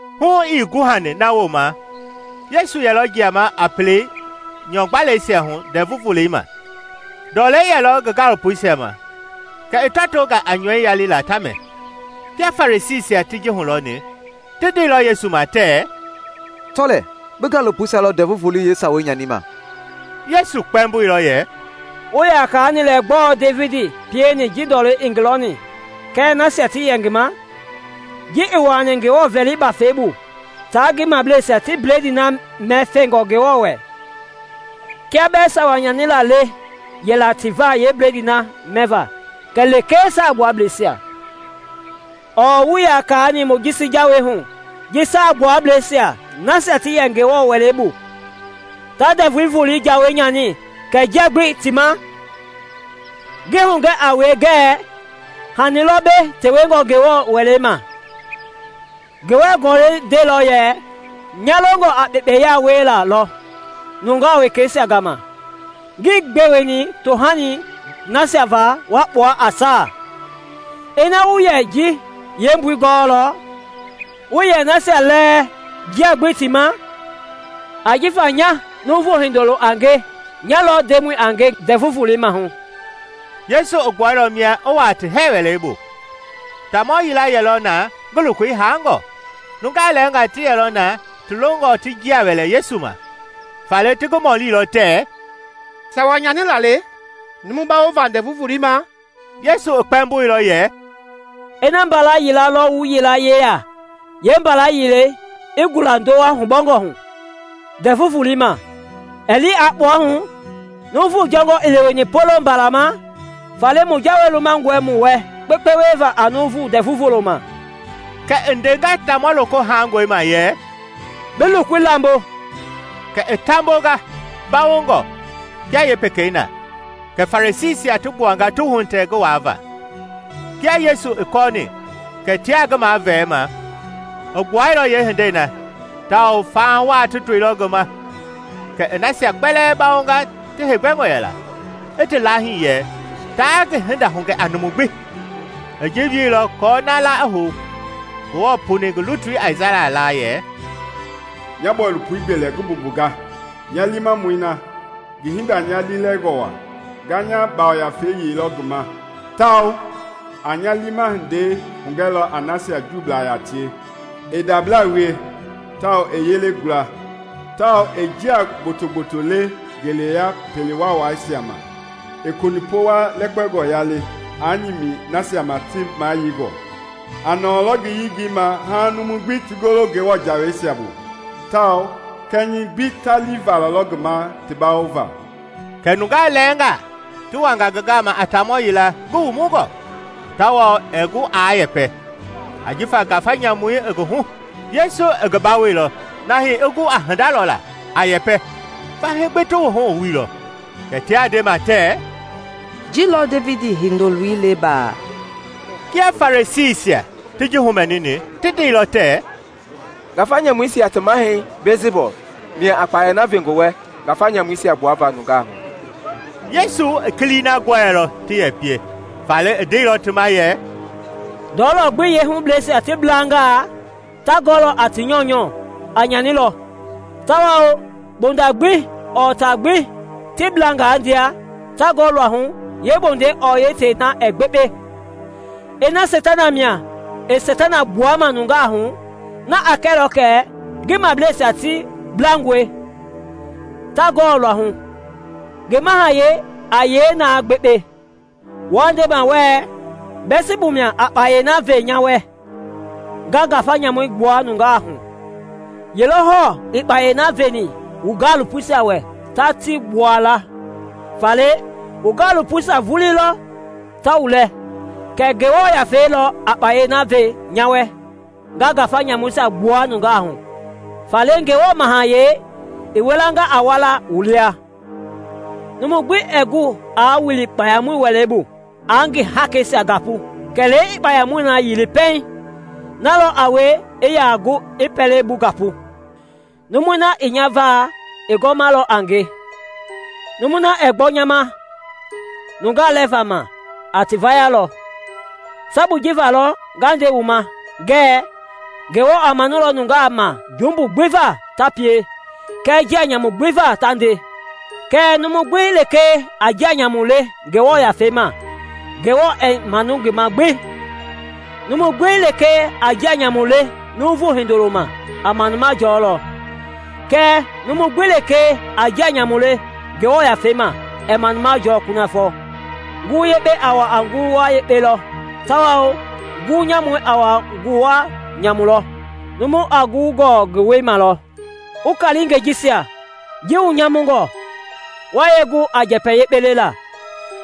Hu ii guhani na wooma Yesu yɛlɔ jiama a pelei nyɔ-gbalɛisia hu Ndɛvu Volei ma. Ndɔlei yɛlɔ ngi gaalopoisia ma kɛ ti tɔtonga a nyɔi yalilaa ta mɛ. Kia Farisiisia ti ji hulɔni, ti ndeilɔ Yesu ma tɛɛ, “Tɔ lɛɛ, bi gaalopoisia lɔ Ndɛvu Volei yeesawei nyanima!” Yesu kpɛmboilɔ yɛ, “Wuii yaa kaani lɛ gbɔɔ Devidi pieni ji ndɔlei i ngi lɔni kɛɛ nasia ti yɛ ngi ma, ji i wuaani Ngewɔ Veli bafɛi bu tia ngi mableisia ti bledii na mɛ fengɔ Ngewɔ wɛ, kia bɛɛ sawa nyanila le yɛla ti va yee bledii na mɛva kɛ lekee Saagbuablɛisia? ɔɔ wuii yaa kaani Mojisi jawei hu ji Saagbuablɛi nasia ta yɛ Ngewɔ wɛlei bu ta Ndɛvu Volei jawei nyani kɛɛ njia gbii ti ma? Ngi hugɛ a wue kɛ hani lɔ mbei tewengɔ Ngewɔ wɛlei ma. Ngewɔ Gɔlɛi ndeilɔ yɛ, ‘Nya longɔ a kpekpeya wiela lɔ nungaa wekeisia gama, ngii gbeweni tohanii nasia va wa kpua a saa.’ Ina wu yɛ ji yeembui gɔɔlɔ, wuii yɛ nasia lɛɛ njia gbii ti ma. Ajifa nya Nuuvu Hindoloi a nge nya lɔ Ndemɔ a nge Ndɛvu Volei maahu.” Yesu i gbuailɔ mia i wuaa ti hɛɛ wɛlei bu. Taamɔ yila yɛlɔ na ngi lokoi haangɔ. Nungaa lɛɛnga ti yɛlɔ na ti longɔ ti njia wɛlɛ Yesu ma, faale ti ngi mɔlilɔ tɛɛ, “Sawa nyanila le numu bawova Ndɛvu Volei ma?” Yesu i kpɛmboilɔ yɛ, “Ina mbala yila lɔ wu yilaye yeya, yeembalɛi i gula ndowa hubɔngɔ hu Ndɛvu Volei ma, ɛɛ li aa kpua hu? Nuuvu jɔngɔ i leweni poloŋ mbala ma. Faale mu jawei lumangɔe mu wɛ kpekpe wieva a nuuvu Ndɛvu Volei ma!” Kɛ i ndenga taamɔ loko haangɔi ma yɛ, “Bi lokoi lambo.” Kɛ i taambonga mbawongɔ kia yeepekei na. Kɛ Farisiisia ti gbuanga ti wuhitɛ ngi waava. Kia Yesu i kɔɔni kɛ tiaa ngi mavɛɛma, i gbuailɔ yeehindei na tawao faha waa ti toilɔ ngi ma kɛ i nasia kpɛlɛɛ bawonga ti heegbɛngɔ yɛla, i ti laahii yɛ taa ngi hinda hugɛ a numu gbi. I ji wieilɔ aako na la i hou Ngewɔ puni ngi lutui Aisaya laa yɛ: “Nya bɔilopoi gbelɛ ngi mbumbunga, nya liimamɔi na ngi hinda i nya liilɛlingɔ waa. Nga nya yafei yeilɔ ngi ma, tawao a nya liima hindei hugɛlɔ a nasia Juublaa yaa tie. Ɛɛ ndablaa wie tawao ɛɛ yele gula, tawao ɛɛ njia gboto-gboto le ngeleya pele waawaisia ma. Ɛɛ konipɔwa lɛkpɛngɔ yali aa nyimi nasia ma ti mayeingɔ, A nɔɔlɔ ngi yengei ma haaŋ numui gbi ti golo Ngewɔ jaweisia bu; tawao kɛnyɛi gbi ta lii valalɔ ngi ma ti bawova.” Kɛ nungaa lɛɛnga ti wanga ngi gama a taamɔ yila ngi wumungɔ, tawao ɛɛ gu aa yɛpɛ, ajifa ngafa nyamu i ngi hu. Yesu i ngi bawoilɔ na hii i gu a hinda lɔla, a yɛpɛ. Fahii gbi ti wuhu i wuilɔ, kɛ tia ndema tɛɛ, “Ji lɔ Devidi Hindoloi le baa?” Kia Farisiisia ti ji humɛnini, ti ndeilɔ tɛɛ, “Ngafa nyamuisia ti mahɛi Biɛlsibu mia a kpayei na ve ngi wɛ ngafa nyamuisia gbuava nungaa hu.” Yesu i kilii na gɔɛilɔ ti yɛ pie, faale i ndeilɔ ti ma yɛ, “Ndɔlɔ gbi yeehubleisia ti blangaa, ta gɔ a ti nyɔunyɔ a nyanilɔ, tawao mbonda gbi ɔɔ taa gbi ti blangaadia, ta gɔ luahu, yeembondei ɔɔ tei na ɛɛ gbekpe. Ina Seitana mia i Seitana gbuama nungaa hu, na a kɛlɔ kɛ ngi mableisia ti blangɔe, ta gɔ luahu; ngi mahayɛi a yee na gbekpe? Wuaa ndema wɛɛ Biɛlsibu mia a kpayei na ve nya wɛ nga ngafa nyamuisia gbua la nungaa hu. Ye lɔ hɔɔ i kpayei na veni wu gaalopoisia wɛ ta ti gbua la? Faale wu gaalopoisia vulii lɔ ta wu lɛɛ. Kɛɛ Ngewɔ Yafei lɔ a kpayei na ve nya wɛ nga ngafa nyamuisia gbua nungaa hu, faale Ngewɔ Mahayɛi i wilanga a walaa wu lia. “Numu gbi ɛɛ gu aa wili kpayamɔi wɛlei bu aa ngi haakeisia gapu kɛlee a kpayamɔi yili pɛiŋ; na lɔ a wie i yaa gu i pɛlei bu gapu. “Numui na ii nya va i gɔmalɔ a nge; numui na ɛɛ gbɔ nya ma nungaa lɛva ma, a ti vayalɔ. Sabui ji va lɔ nga nde wu ma ngɛɛ Ngewɔ a manulɔ nungaa ma jumbu gbi va ta pie kɛɛ njia nyamu gbi ta nde, kɛɛ numu gbi lekee a njia nyamu le Ngewɔ Yafei ma, Ngewɔ ɛɛ manu ngi ma gbi. Numu gbi lekee a njia nyamu le Nuuvu Hindoloi ma a manuma jɔlɔ; kɛɛ numu gbi lekee a njia nyamu le Ngewɔ Yafei ma ɛɛ manuma jɔɔ kunafɔ. “Ngulu yekpei a wua a nguluwa yekpe lɔ tawao ngulu nyamui a wua a nguluwa nyamu lɔ. Numu a ngulii gɔɔ ngi wɛi ma lɔ. Wu kaalingɛi jisia! Ji wu nyamungɔ, wa yee gu a njɛpɛ yekpe lela?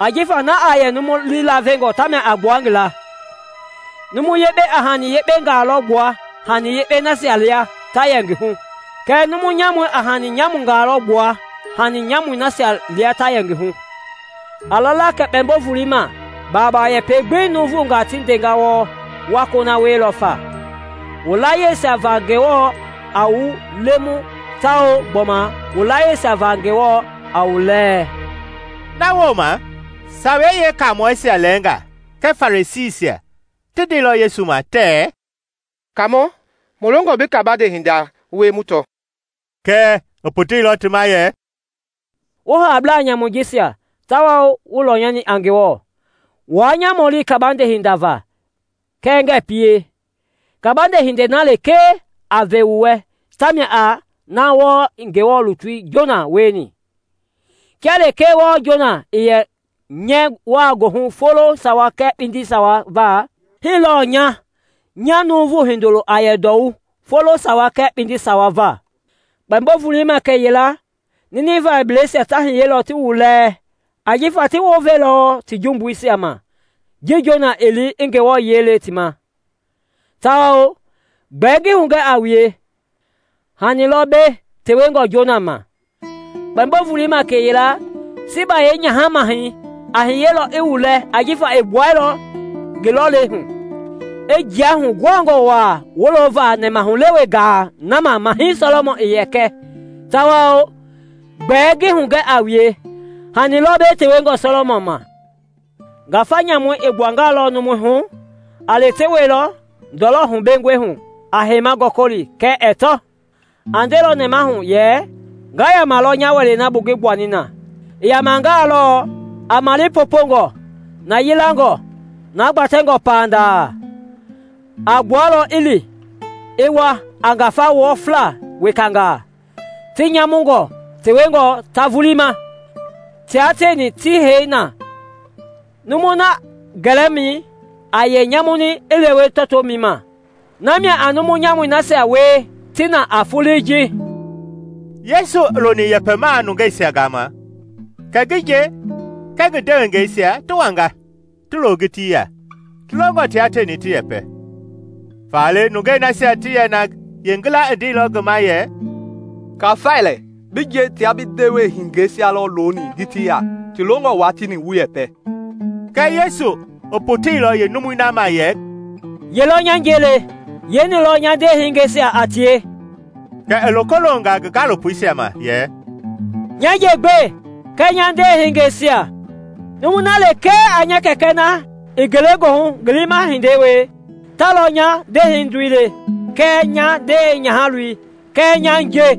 Ajifa na a yɛ numu lii lavengɔ tamia a gbua ngi laa. Numu yekpei a hani yekpengaa lɔ gbua hani yekpei nasia lia ta yɛ ngi hu, kɛɛ numu nyamui a hani nyamungaa lɔ gbua hani nyamui nasia lia ta yɛ ngi hu. “A lala kɛ kpɛmbo volei ma, baaba yɛpɛ gbi nuuvungaa ti ndenga wɔɔ wa kona wielɔ fa. Wu layieisia va lɔ Ngewɔ a wu lemu tawao gbɔma wu laayiɛisia va lɔ Ngewɔ a wu lɛɛ.” Na wooma Sawei Yeekaamɔisia lɛɛnga kɛɛ Farisiisia ti ndeilɔ Yesu ma tɛɛ, “Kaamɔ, mu longɔ bi kabande hinda wie mu tɔ.” Kɛɛ i poteilɔ ti ma yɛ, “Wu haablaa nyamui jisia tawao wuii lɔnyani a Ngewɔ! Wuaa nya mɔlima kabande hinda va kɛɛ ngɛɛ pie. Kabande hindei na lekee a ve wu wɛ tamia a na wɔɔ i Ngewɔ lutui Jona wieni. Kia lekee wɔɔ Jona i yɛ nyɛɛ wai goohu folo sawa kɛɛ kpindi sawa va, hii lɔɔ nya nya Nuuvu Hindoloi a yɛ ndɔwu folo sawa kɛɛ kpindi sawa va. Kpɛmbo volei ma kɛyila Ninivɛblɛisia ta hiyelɔ ti wu lɛɛ ajifa ti wounveilɔ ti jumbuisia ma ji Jona i Ngewɔ yiɛi lɛni ti ma; tawao gbɛɛ ngi hugɛ a wue, hani lɔ mbei tewengɔ Jona ma. Kpɛmbo volei ma kɛyila Siiba yeenyaha-mahɛi a hiyelɔ i wu lɛɛ ajifa i gbuailɔ ngi lɔlei hu, i jia huguhangɔ waa wolovaa nɛmahulewe gaa na ma Mahɛi Sɔlɔmɔn i yɛ kɛ, tawao gbɛɛ ngi hugɛ a wue, hani lɔ mbei tewengɔ Sɔlɔmɔn ma.” “Ngafa nyamui i gbuangalɔ numui hu, a lewetewelɔ ndɔlɔ hubengɔi hu a heima gɔkɔli kɛɛ ɛɛ tɔ. A ndelɔ nɛmahu yɛ, ‘Nga yamalɔ nya wɛlei na bu ngi gbuani na.’ I yamangalɔ, a male popongɔ, na yilangɔ, na gbatɛngɔ pandaa. A gbualɔ, i li, i wa a ngafa wɔfla wekangaa, ti nyamungɔ tewengɔ ta vulii ma, tia tieni ti hei na. Numui na gɛlɛmɛi a yɛ nyamuni i lewe tɔtomɛi ma. Namia a numu nyamui nasia wie ti na a foloi ji.” Yesu i loni yɛpɛmaa nungeisia gama kɛ ngi nje kɛɛ ngi ndewehingeisia ti wanga, ti lo ngitii ya, ti longɔ tia tieni ti yɛpɛ. Faale nungei nasia ti yɛ na yeengila i ndeilɔ ngi ma yɛ, “Kafai lɛ, bi nje tia bi ndewehingeisia lɔ looni ngitii ya ti longɔ wua tieni wu yɛpɛ.” Kɛɛ Yesu i poteilɔ yeenumui na ma yɛ, “Ye lɔ nya nje le? Yeeni lɔ nya ndewehingeisia a tie?” Kɛ i loko longa ngi gaalopoisia ma yɛ, “Nya nje gbe kɛɛ nya ndewehingeisia! Numui na lekee a nya Kɛkɛ na i ngelegoohu ngi liima hindei wie ta lɔ nya ndewehindoi le kɛɛ nya ndewe nyahaloi kɛɛ nya nje.”